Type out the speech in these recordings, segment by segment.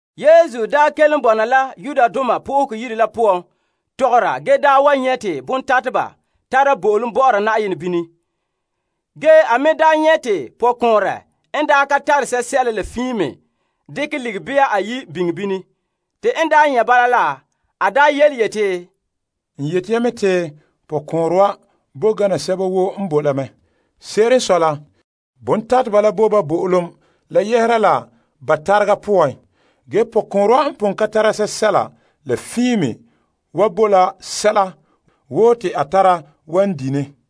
Yesu daa kelom bɔna la Yenɛ Yire la poan tɔgɔra ge nyɛ' te bontateba tara bo'olom bɔ'ɔra Na'ayenɛ bini. Ge a me nyɛ' te pɔkɔɔnrɛ n ka tare sɛla la fiin me dekɛ ligikɔnba iyi' biŋe bini. Te en nyɛ' bala la, a yeti, N yete ya mɛ te pɔkɔɔnrɛ wa, bo gana sɛba woo n bo la mɛ. Se'ere n sɔe la, bontateba la bo ba bo'olom la yɛhera la ba tarega la poan. Ge pɔkɔɔnrɛ wa n pon ka tare sɛla la fiin me wa bo la sɛla woo te a tara wan di' ne.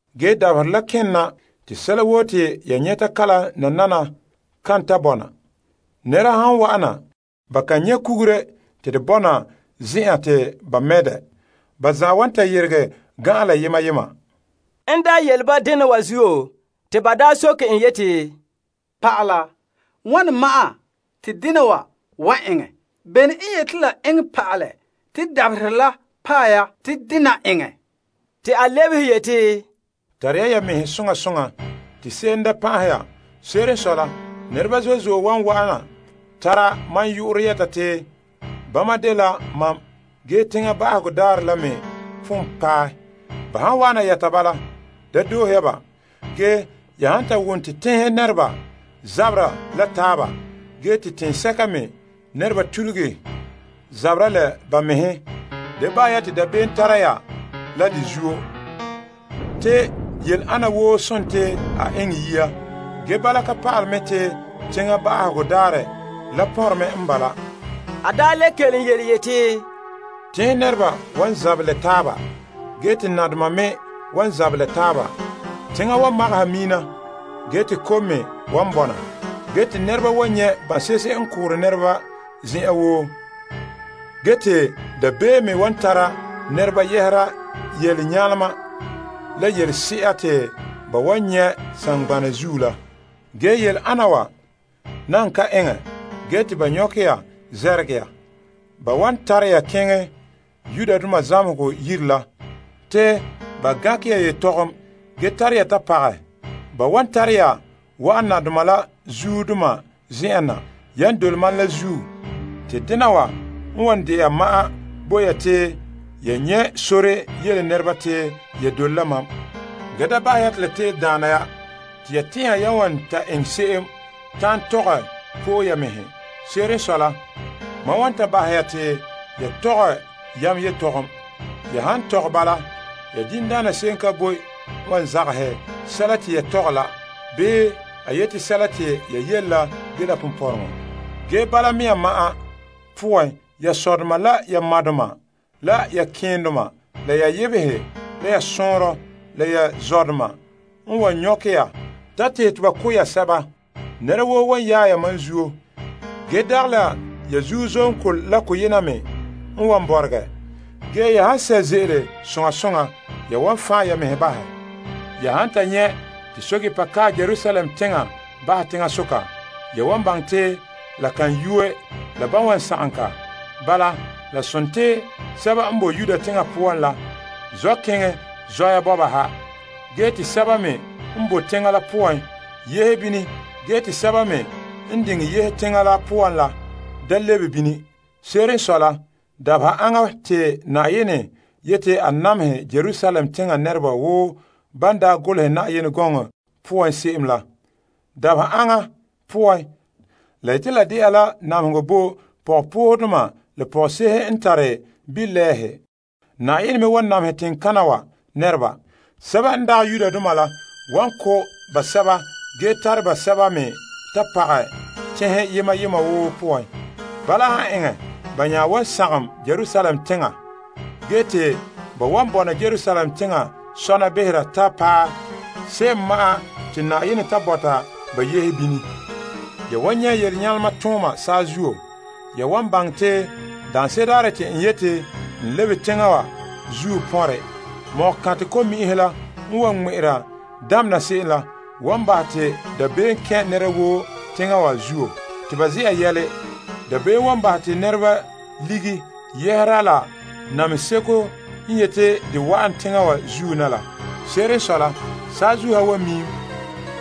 Dabaherɛ kene na te sɛla woo te ya nyɛta kalam nanana kan ta bɔna. Nɛreba han wa'ana, ba kan nyɛ' kugure te de bɔna zen'en te ba mɛ' dɛ. Ba zan'an wan ta yeregɛ gan'an la yema yema. En yele ba dena wa zuo te ba soke en yeti, Pa'ala, wane ma'an te dena wa eŋɛ? Bene n yete la eŋɛ pa'alɛ te dabaherɛ la paɛ ya te dena eŋɛ? Te a lebehe yeti, Tare ya ya mɛhe soŋa soŋa te se'em da pan'ahɛ ya. Se'ere n sɔe la, nɛreba zo'e zo'e wan wana tara mam yu'urɛ yɛta ya te bama dela mam ge teŋa ba'ahegɔ daarɛ la me pon paɛ. Ban han wana yɛta ya bala, da doohe ya ba. Ge ya han ta wom te teŋhe nɛreba zabera la taaba ge te teŋsɛka me nɛreba tuluge zabera la ba mɛhe, da bahɛ ya te dabeem tara ya la de zuo. Te yele ana woo sontii a eŋɛ yia. Ge bala ka pa'ale mɛ te teŋa wa ba'ahegɔ daarɛ la pɔnre me n bala. A le kelom yeti, Teŋhe nɛreba wan zabɛ la taaba ge te nadoma me wan zabɛ la taaba. Teŋa wan magaha miina ge te kom me wan bɔna. Ge te nɛreba wan nyɛ' ban'se'ehe n koore nɛreba zen'en woo. Ge te dabeem me wan tara nɛreba yɛhera yelenyalema la yelese'a te ba wan nyɛ' saŋgbanɛ zuo la. Ge, yele ana wa nan kan eŋɛ ge te ba nyɔkɛ ya namehɛ ya. Ba wan tare ya keŋɛ zamehegɔ yire la te ba gankɛ ya yetɔgom ge tare ya ta pagɛ. Ba wan tare ya wa'an nadoma la zuodoma zen'en na yan dole mam la zuo. Te dena wa n wan de'a ma'an bo ya te ya nyɛ' sore yele nɛreba te ya dole la mam. Ge daa bahɛ ya te la te'ele daana ya te ya tɛn'ɛha ya wan ta eŋɛ se'em ta'an tɔgɛ po'e ya mɛhe. Se'ere n sɔe la, mam wan ta bahɛ ya te ya tɔgɛ yam yetɔgom. Ya han tɔgɛ bala, ya diŋdaana se'em ka boe n wa zagɛ sɛla te ya tɔgɛ la bii a yete sɛla te ya yele la dela ponpɔrɔŋɔ. Ge bala mea ma'an poan ya sɔdoma la ya madoma, la ya keendoma la ya yebehe, la sɔɔnrɔ, la ya zɔdoma n wan nyɔkɛ ya ta tehɛ te ba ko' ya sɛba. Nɛra woo wan yaɛ ya mam zuo. Ge, dagɛ la ya zusoŋɔ la koyema me n wan bɔregɛ. Ge ya han sɛ' ze'ele soŋa soŋa, ya wan fan' ya mɛhe bahɛ. Ya han ta nyɛ' te pɛɛntɛɛnreba kae Yerusalem teŋa bahɛ teŋasoka, ya wan baŋɛ te la kan yuue la ban wan sagom ka. Bala, la sontii, sɛba n boe Yudea teŋa poan la zɔ' keŋɛ zɔya bɔba ha, ge te sɛba me n boe teŋa la poan yehe bini ge te sɛba me n diŋɛ yehe teŋa la poan la da lebe bini. Se'ere n sɔe la, dabeha aŋa te Na'ayenɛ yeti a namehɛ Yerusalem teŋa nɛreba wo ba daa golehɛ Yenɛ gɔŋɔ poan se'em la. Dabeha ana poan, la yete la de'a la namehegɔ bo pɔgɔpoohedoma la pɔgɔse'ehe n tare bilɛɛhe. Na'ayenɛ me wan namehɛ teŋkana wa nɛrebana. Sɛba n dagɛ Yudoma la wan ko' ba, basɛba ge tare ba basɛba me ta pagɛ teŋhe yema yema woo poan. Bala han eŋɛ, ba nya wan sagom Yerusalem teŋa. Ge te ba wan bɔna Yerusalem teŋa sɔna behera ta paɛ se'em ma'an te Na'ayenɛ ta bɔta ba yehe bini. Ya wan nyɛ' toon nyalema tona saazuo, ya wan baŋɛ te daanse'ere daarɛ te n yeti n lebe teŋa wa zuo pɔnrɛ. Mɔgɔkantɛ ko'mi'inhe la n wan ŋmɛ'ɛra damena se'em la, wan bahɛ te dabeem kɛn' nɛra woo teŋa zuo te ba ze'a yɛla. Dabeem wan bahɛ te nɛreba lige yɛhera la namehe seko n yete de wa'an teŋa woo zuo na la. Se'ere n sɔe la, saazuo ha miim.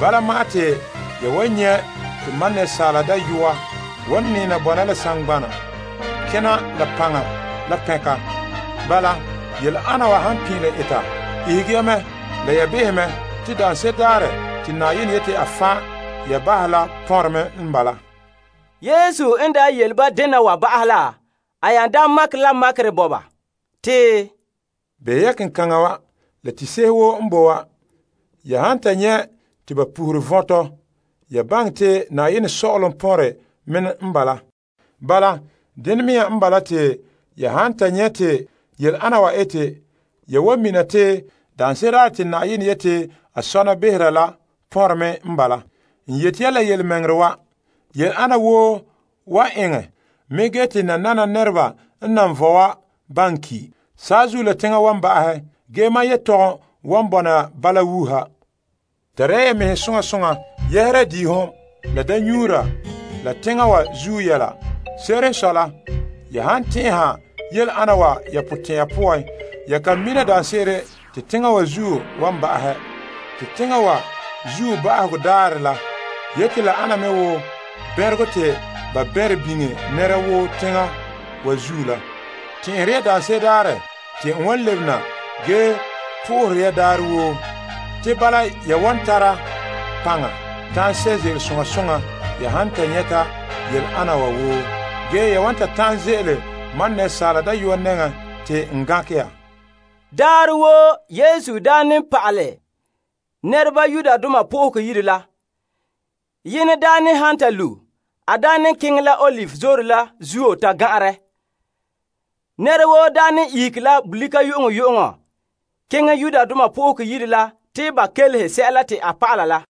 Bala ma'an te ya wan nyɛ' te Asaala Dayɔa, wan nɛɛ na bɔna la saŋgbanɛ kena la paŋa la pɛnka. Bala yele ana wa han pin'ilom eta, ihege ya mɛ la ya beha mɛ te daanse'ere daarɛ te Na'ayenɛ yete a fan' ya bahɛ la pɔnre me n bala. Yesu n daa yele ba dena wa ba'ahɛ la, a nya makɛ la makerɛ bo ba te, Behɛ ya kenkaŋa wa la tiihe se'ehe woo n boe wa. Ya han ta nyɛ' te ba pohore vɔntɔ, ya baŋɛ te Na'ayenɛ Sɔ'ɔlom pɔnrɛ me n bala. Bala, dene mea n bala te ya han ta nyɛ' te yele ana wa ete, ya wan mina te daanse'ere daarɛ te Na'ayenɛ yete a sɔna behera la pɔnre me n bala. N yete ya yelemɛŋɛrɛ wa yele ana wa woo wa eŋɛ mɛ ge te nanana wa nɛreba n nan vɔe wa baŋɛ ki'. Saazuo la teŋa wan ba'ahɛ. Ge mam yelehom wan bɔna la bala wuuha. Tare ya ya mɛhe soŋa soŋa yɛhera diihom la daamnyuura, la teŋa wa zuo yɛla. Se'ere n sɔe la, ya han tɛn'ɛha yele ana wa ya potɛn'ya poan, ya kan mina daanse'ere daarɛ te teŋa wa zuo wan ba'ahɛ. Te teŋa wa zuo ba'ahegɔ daarɛ la yete la ana wo bɛnregɔ te ba bɛnrɛ biŋe nɛra woo teŋa wa zuo la. Tɛn'ɛhere ya daanse'ere daarɛ te n wan lebe na ge po'ohere ya daarɛ woo. Te bala ya wan ta tara paŋa ta'an sɛ' ze'ele soŋa soŋa ya han ta nyɛta yele ana wa woo. Ge ya wan ta ta'an ze'ele Asaala Dayɔa nɛŋa te n gankɛ ya. Daarɛ woo, Yesu daa ne pa'ala nɛreba Yenɛ Yire la. Yenɛ ne han ta lu', a ne keŋɛ la Olive Zoore la zuo ta gan'anrɛ. Nɛra woo ne ihege la bolika yu'uŋyu'uŋɔ keŋɛ Yenɛ Yire la te ba kelehe sɛla te a pa'ala la.